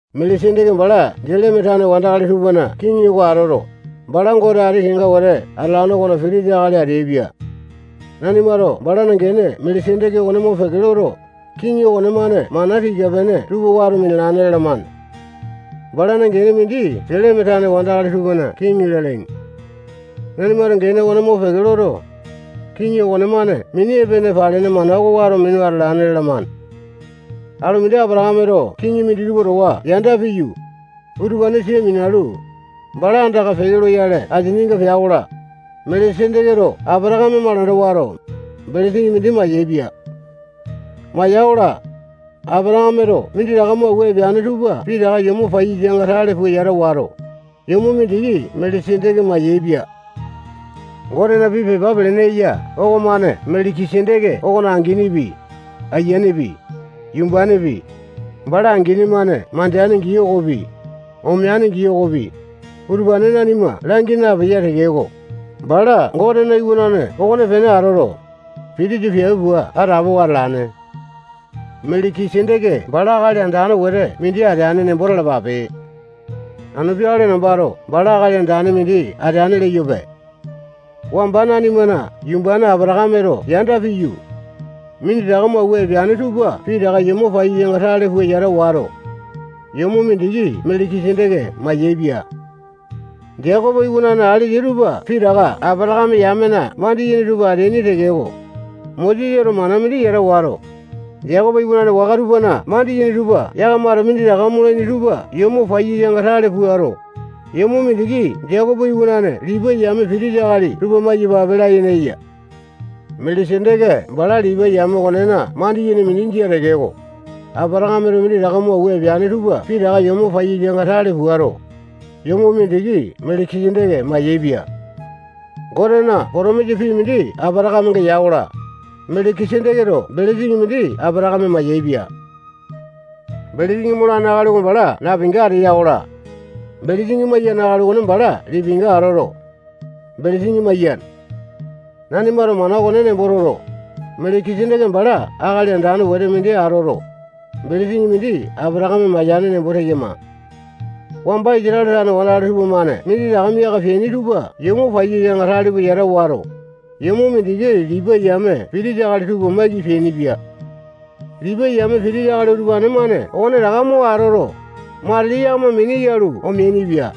Meleki-seteke bala Seleme tane wandakali tupana kiŋi oko atoto, bala Gote ati kenga wete atalane okona pitisa akali ateaipia. Nanimato balana gene Meleki-seteke okone mopeke loto, kiŋi okonemane mana tika-pene tupa wato minalane lalamane. Balana gene mindi Seleme tane wandakali tupana kiŋi lalaini. Nanimato gene okone mopeke loto, kiŋi okonemane mini epene palene mana oko wato minu atalane lalamane. Alu mindi Apatakameto kiŋi minditupa towa yanda piyu, utupane sia minalu, bala andaka peke loyale asininga pea-kola, Meleki-seteketo Apatakame malanda wato, belesini mindi mayaepia. Maya-kola, Apatakameto minditaka mo awua epeane tupa pitaka yomo paiyasanga tale pua yata wato, yomo mindiki Meleki-seteke mayaepia. Gotena pii pepa pelene eya okomane Meleki-seteke okona anginipi, ayianepi, yumbanepi, bala angini-mane mandeane gii okopi, omeane gii okopi, utupane nanima langi napeya tekeko, bala Gotena iwanane okonepene atoto, pitisa piape pua atapowa atalane. Meleki-seteke bala akali andane wete mindi ateane nembo talapape. Anu peakale nambato bala akali andane mindi ateane leyope. Wamba nanimana yumbane Apatakameto yanda piyu, minditaka mo awua epeane tupa pitaka yomo paiyasanga tale pua yata wato, yomo mindiki Meleki-seteke mayaepia. Jekopo iwanane alesa tupa pitaka Apatakame yamena mandiyene tupa ateaini tekeko, Mosesato mana mindi yata wato, Jekopo iwanane waka tupana mandiyene tupa yakamato minditaka molaini tupa yomo paiyasanga tale puato, yomo mindiki Jekopo iwanane Lipai yame pitisa akali tupa maiyapape layene eya. Meleki-seteke bala Lipai yame okonena mandiyene mindi jia tekeko, Apatakameto minditaka mo awua epeane tupa pitaka yomo paiyasanga tale puato, yomo mindiki Meleki-seteke mayaepia. Gotena potomisa pii mindi Apatakamenga ya-kola, Meleki-seteketo belesini mindi Apatakame mayaepia. Belesini molane akali oko bala napinga ateya-kola, belesini maiyane akali okone bala lipinga atoto, belesini maiyane. Nanimato mana okone nembo toto, Meleki-seteke bala akali andane wete mindi atoto, belesini mindi Apatakame mayane nembo teyama. Wamba Isatale tane wandakali tupamane minditaka miaka peaini tupa yomo paiyasanga tale pua yata wato, yomo mindiki Lipai yame pitisa akali tupa maiki peainipia. Lipai yame pitisa akali utupane-mane okonetaka mo atoto, matili yakama mini yalu omeainipia.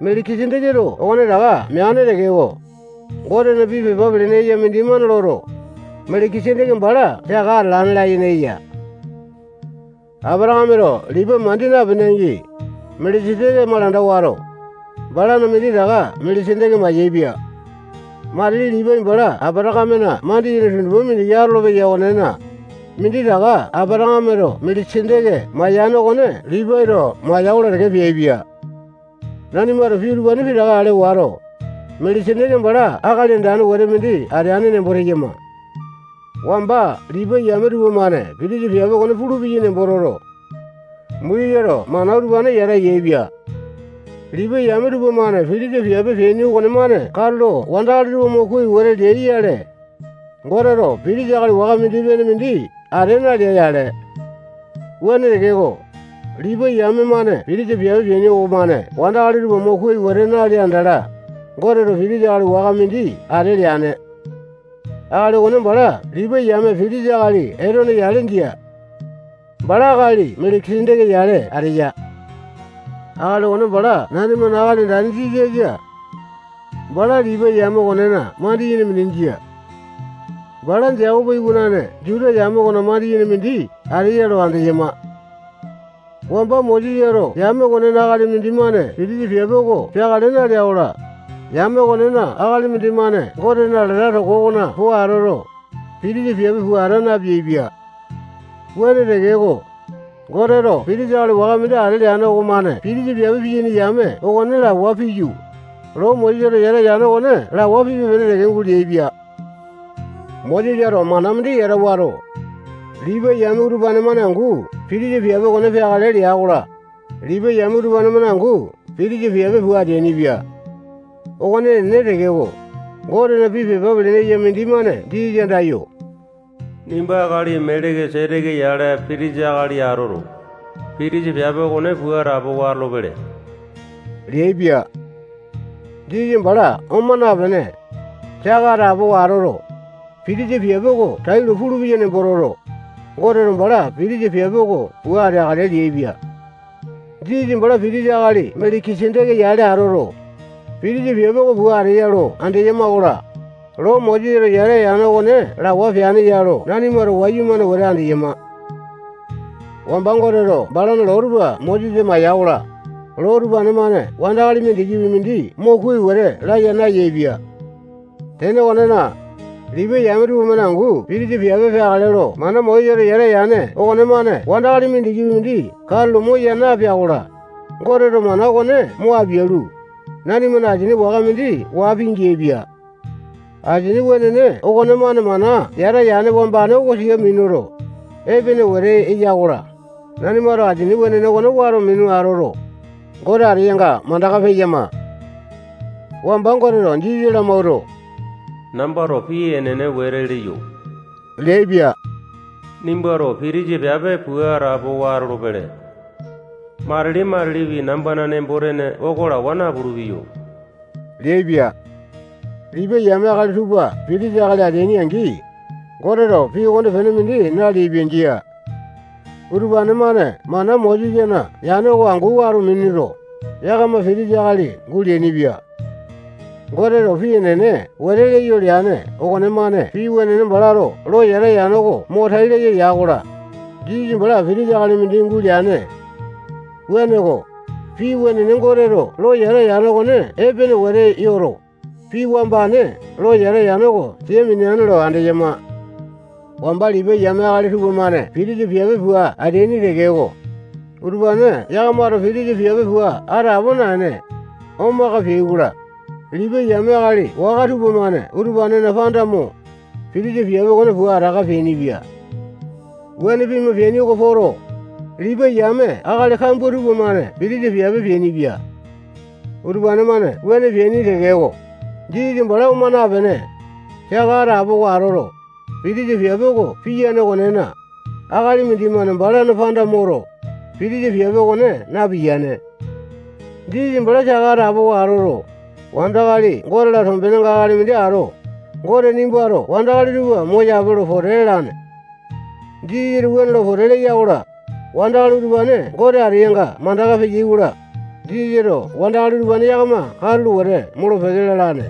Meleki-seteketo okonetaka meane tekeko, Gotena pii pepa pelene eya mindimane loto, Meleki-seteke bala saka atalane layene eya. Apatakameto Lipai mandi napene angi, Meleki-seteke malanda wato, balana minditaka Meleki-seteke mayaepia. Matili Lipai bala Apatakamena mandiyene tundupa mindiki atolopeya okonena, minditaka Apatakameto Meleki-seteke mayane okone Lipaito maiyene maiya-kola teke peaipia. Nanimato pii utupane pitaka ale wato, Meleki-seteke bala akali andane wete mindi ateane nembo teyama. Wamba Lipai yame tupamane pitisa piape okone pulupeyai nembo toto, Mosesato mana utupane yata yaepia. Lipai yame tupamane pitisa piape peaini okonemane katulo wandakali tupa mo kuai wete leai-yale, Goteto pitisa akali waka mindi-pene mindi ate nalea-yale. Wuane tekeko, Lipai yame-mane pitisa piape peaini okomane wandakali tupa mo kuai wete nalea andala, Goteto pitisa akali waka mindi ate leane. Akali okone bala Lipai yame pitisa akali Etone yale jia. Bala akali Meleki-seteke yale ateya. Akali okone bala nanimana Akali Andane Jisasa. Bala Lipai yame okonena mandiyene mindi jia. Bala Jekopo iwanane Juta yame okona mandiyene mindi ateya lo andeyama. Wamba Mosesato yame okonena akali mindimane pitisa piape oko peakale nalea-kola, yame okonena akali mindimane Gotena alata toko okona po atoto, pitisa piape pua ata napeaipia. Wuane tekeko, Goteto pitisa akali waka mindi ate leane okomane pitisa piape piyaini yame okone lawa piyu, loo Mosesato yata yane okone lawa pipe-pene teke guleaipia. Mosesato mana mindi yata wato, Lipai yame utupane-mane angu pitisa piape okone peakale lea-kola, Lipai yame utupane-mane angu pitisa piape pua ateainipia. Okone enene tekeko, Gotena pii pepa pelene eya mindimane Jisasa andayo, nimba akali Meleki-seteke yale pitisa akali atoto, pitisa piape okone pua atapowa atolopele leaipia. Jisasa bala oma napene, saka atapowa atoto, pitisa piape oko tailo pulupeya nembo toto, Goteto bala pitisa piape oko pua ateakale leaipia. Jisasa bala pitisa akali Meleki-seteke yale atoto, pitisa piape oko pua ateya lo andeyama-kola, loo Mosesato yata yane okone lawa peane ya lo nanimato wayumane wete andeyama. Wamba Goteto balana loo tupa Mosesa maiya-kola, loo utupane-mane wandakali mindikipi mindi mo kuai wete laya nayaepia. Tene okonena, Lipai yame tupamane angu pitisa piape peakale lo mana Mosesato yata yane okonemane wandakali mindikipi mindi katulo moya napea-kola, Goteto mana okone mo apialu, nanimana asini waka mindi waa pingeaipia. Asini wenene okonemane mana yata yane wambane oko sia minuto, epene wete eya-kola, nanimato asini wenene okone wato minu atoto, Gote ateyanga mandaka peyama. Wamba Goteto Jisasa lamawuato, nambato pii enene wete leyo leaipia. Nimbato pitisa piape pua atapowa atolopele. Matili-matilipi nambana nembo-tene oko lawa napulu-peyo leaipia. Lipai yame akali tupa pitisa akali ateai-angi, Goteto pii okonepene mindi naleaipia. Jia. Utupane-mane mana Mosesana yane oko angu wato minuto, yakama pitisa akali guleainipia. Goteto pii enene wete leyo leane okonemane pii wenene balato lo yata yane oko mo tai laya ya-kola, Jisasa bala pitisa akali mindi guleane. Wuaneko, pii wenene Goteto lo yata yane okone epene wete yoto, pii wambane lo yata yane oko sia mineane lo andeyama. Wamba Lipai yame akali tupamane pitisa piape pua ateaini tekeko, utupane yakamato pitisa piape pua atapo naene, omaka peai-kola, Lipai yame akali waka tupamane utupanena panda mo, pitisa piape okone pua ataka peainipia. Wuane pima peaini oko poto, Lipai yame akali kambua tupamane pitisa piape peainipia. Utupane-mane wuane peaini tekeko, Jisasa bala oma napene, saka atapowa atoto, pitisa piape oko piyane okonena, akali mindimane balana panda moto, pitisa piape okone napiyane. Jisasa bala saka atapowa atoto, wandakali Gote-la tombenenga akali mindi ato, Gote nimbato wandakali tupa moyape lo pote lalane. Jisasato wuane lo pote leya-kola, wandakali utupane Gote ateyanga mandaka peyai-kola, Jisasato wandakali utupane yakama katulo wete molo-peke lalane.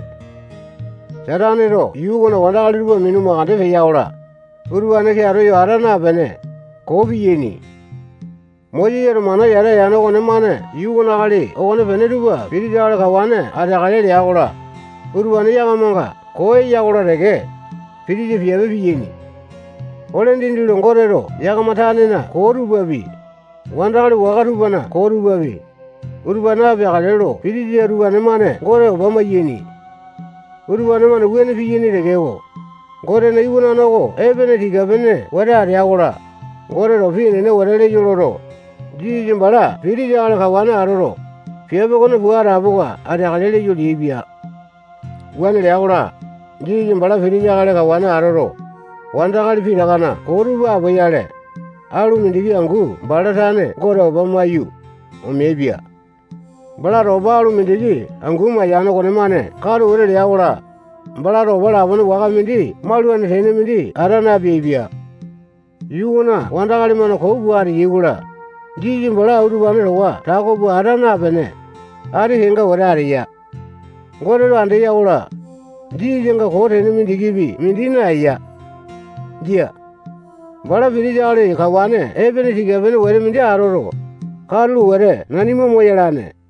Sataneto yuu okona akali tupa minu makande peya-kola, utupane keato yo ata napene, koo piyaini. Mosesato mana yata yane okonemane yuu okona akali okonepene tupa pitisa akali kawane ateakale lea-kola, utupane yakamanga koo eya-kola teke, pitisa piape piyaini. Ole dindi lo Goteto yakama tanena koo tupapi, wandakali waka tupana koo tupapi, utupane apeakale lo pitisa utupane-mane Gote opa maiyaini. Utupane-mane wuane piyaini tekeko, Gotena iwanane oko epene tika-pene wete atea-kola, Goteto pii enene wete leyo loto, Jisasa bala pitisa akali kawane atoto, piape okone pua atapowa ateakale leyo leaipia. Wuane lea-kola, Jisasa bala pitisa akali kawane atoto, wandakali pitakana koo tupa apoyale, alu mindiki angu bala tane Gote opa maiyu, omeaipia. Balato opa alu mindiki angu mayane okonemane katu wete lea-kola, balato opa lapone waka mindi maulane tene mindi ata napeaipia. Yuu okona wandakali-mane koo pua ateyai-kola, Jisasa bala utupane towa tako pua ata napene, ati kenga wete ateya. Goteto andeya-kola, Jisasanga koo tene mindikipi mindi naeya. Jia. Bala pitisa akali kawane epene tika-pene wete mindi atoto, katulo wete nanima moyalane.